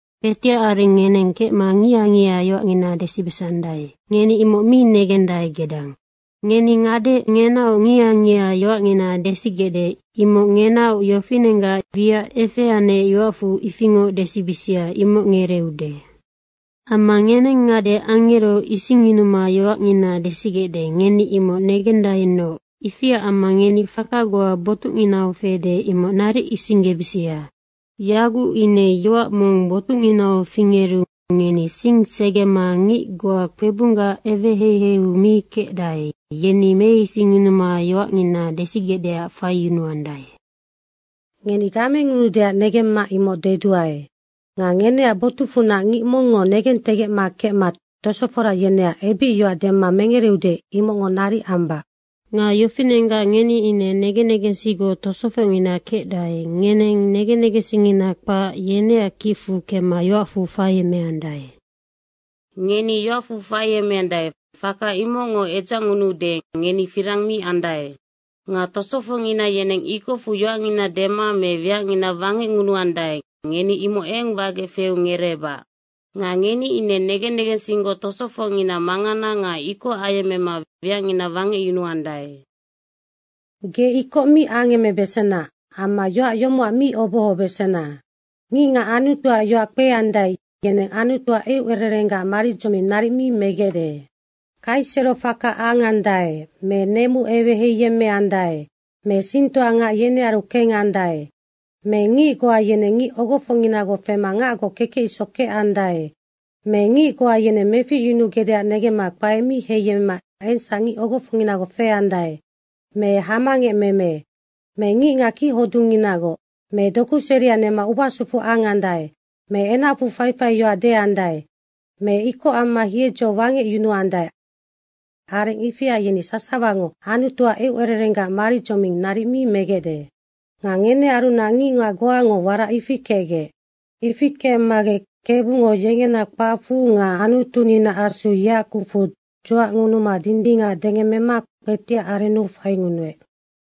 Kpetiac areng ngeneng kecma ngiha ngiha yoacngina desibesandae. Ngeni imoc mi negendae gedang. Ngeni ngade ngenaoc ngiha ngiha yoacngina desigecde, imocac ngenaoc yofinenggac wiac efeanec yoacfu ifingoc desibisia, imoc ngereeude. Amma ngeneng ngade angero isingyunuma yoacngina desigecde, ngeni imoc negendaenoc. Ifiac amma ngeni faka goa botucnginau fede, imoc naric isinggebisia. Yaguc ine yoac mong botucnginau fingeru ngeni sing segema ngic goa kpebunggac eweheiheiu mi kecdae, yeni meisingyunuma yoacngina desigecdeac faiyunuandae. Ngeni gamengunuudeac negemma imoc deduae. Nga ngeneac botucfunac ngic mongngo negentegecma kecma tosofora yeneac ebicyoac dema mengereude, imocngo naric ambac. Nga yofinenggac ngeni ine negen negensinggoc tosofocngina kecdae, ngeneng negen negensingngina kpac, yeneac kicfu kemma yoacfu faiemeandae. Ngeni yoacfu faiemeandae, faka imocngo edzacngunuude ngeni firang mi andae. Nga tosofocngina yeneng ikocfu yoacngina dema me wiacngina wangecngunuandae, ngeni imoc eng wagec feu ngereebac. Nga ngeni ine negen negensinggoc tosofocngina mangana nga ikoc ayemmema wiacngina wangecyunuandae. Ge ikoc mi angemebesena amma yoac yomocac mi obohobesena. Ngicngac Anutuac yoac kpeandae, yeneng Anutuac eucererengaac maridzoming naric mi megecde. Kaisero faka angandae me nemu eweheiyemmeandae me singtoa ngac yenearu kengandae me ngic goa yeneng ngic ogofocnginagoc fema ngacgoc kekec isoc kecandae me ngic goa yeneng meficyunugecdeac negemma kpae mi heiyemmema engsac ngic ogofocnginagoc feandae me hamangecmeme me ngicngac kichodungnginagoc me doku seria nema ubasufu angandae me enacfu faifai yoac deandae me ikoc amma hiedzo wangecyunuandae, areng ifia yeni sasawango Anutuac eucererenggac maridzoming naric mi megecde. Nga ngenearunac ngicngac goango warac ifi kecgec. Ifi kecmagec Kebungo yengena kpacfu nga Anutuninaac Asu yeac kucfu dzuacngunuma dindingac dengemmema kpetiac arennu faingunuec.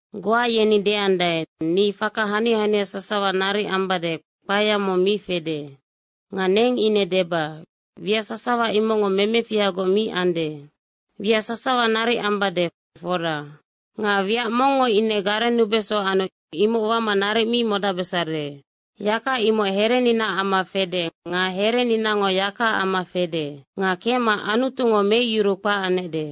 Goa yeni deandae, “Ni faka hania hania sasawa naric ambade, kpaea mong mi fede.” Nga neng ine deba, “Wiac sasawa imocngo memefihagoc mi ande. Wiac sasawa naric ambade, fora. Nga wiac mongngo ine garennubeso anu imoc wama naric mi modacbesare.” Yaka imoc hereninaac amma fede nga hereninango yakaac amma fede. Nga kecma Anutungo meicyuruu kpac anecde.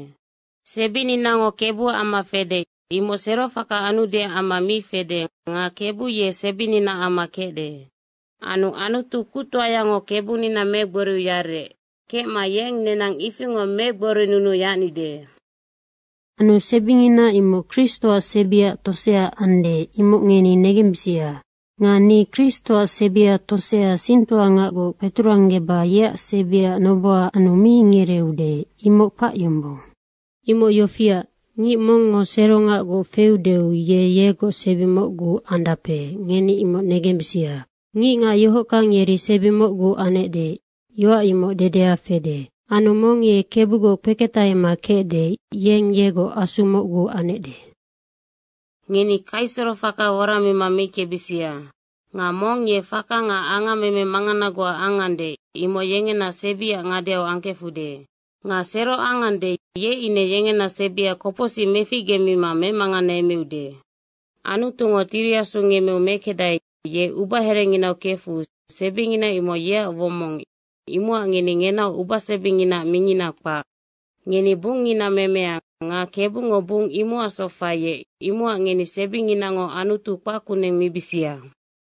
Sebininango Kebuac amma fede, imoc serofaka anudeac amma mi fede nga Kebu ye sebininaac amma kecde. Anu Anutu kuctoayango Kebunina megboriu yarec, kecma yeng nenang ifingoc megborinunuu yacnide. Anu sebingina imoc Kristoac sebiaac tosea ande, ngeni imoc negembisia. Nga ni Kristoac sebia tosea singtoangacgoc kpeturanggeba yeac sebiac noboha anu mi ngereeude, imoc kpac yombong. Imoc yofiac, ngic mongngo serongacgoc feudeu ye yegoc sebi mocgu andape, ngeni imoc negembisia, “Ngicngac yohockang yeri sebi mocgu anecde.” yoac imoc dedea fede. Anu mong ye Kebugoc kpeketahema kecde, yeng yegoc asu mocgu anecde. Ngeni kaiserofaka woramima meickebisia! Nga mong ye faka nga angammeme mangana goa angande, imoc yengena sebiac ngadeu angkefude. Nga sero angande, ye ine yengena sebia kopocsic meficgemima memanganeemeude. Anutungo Tiri Asu ngemmeu mekecdae, ye ubaherenginau kefu sebingina imoc yeac womong, imocac ngeni ngenaoc ubasebinginaac mingina kpac. Ngeni bungngina memea nga Kebungo bung imocacsoc faiec, imocac ngeni sebinginango Anutu kpac kuneng mibisia.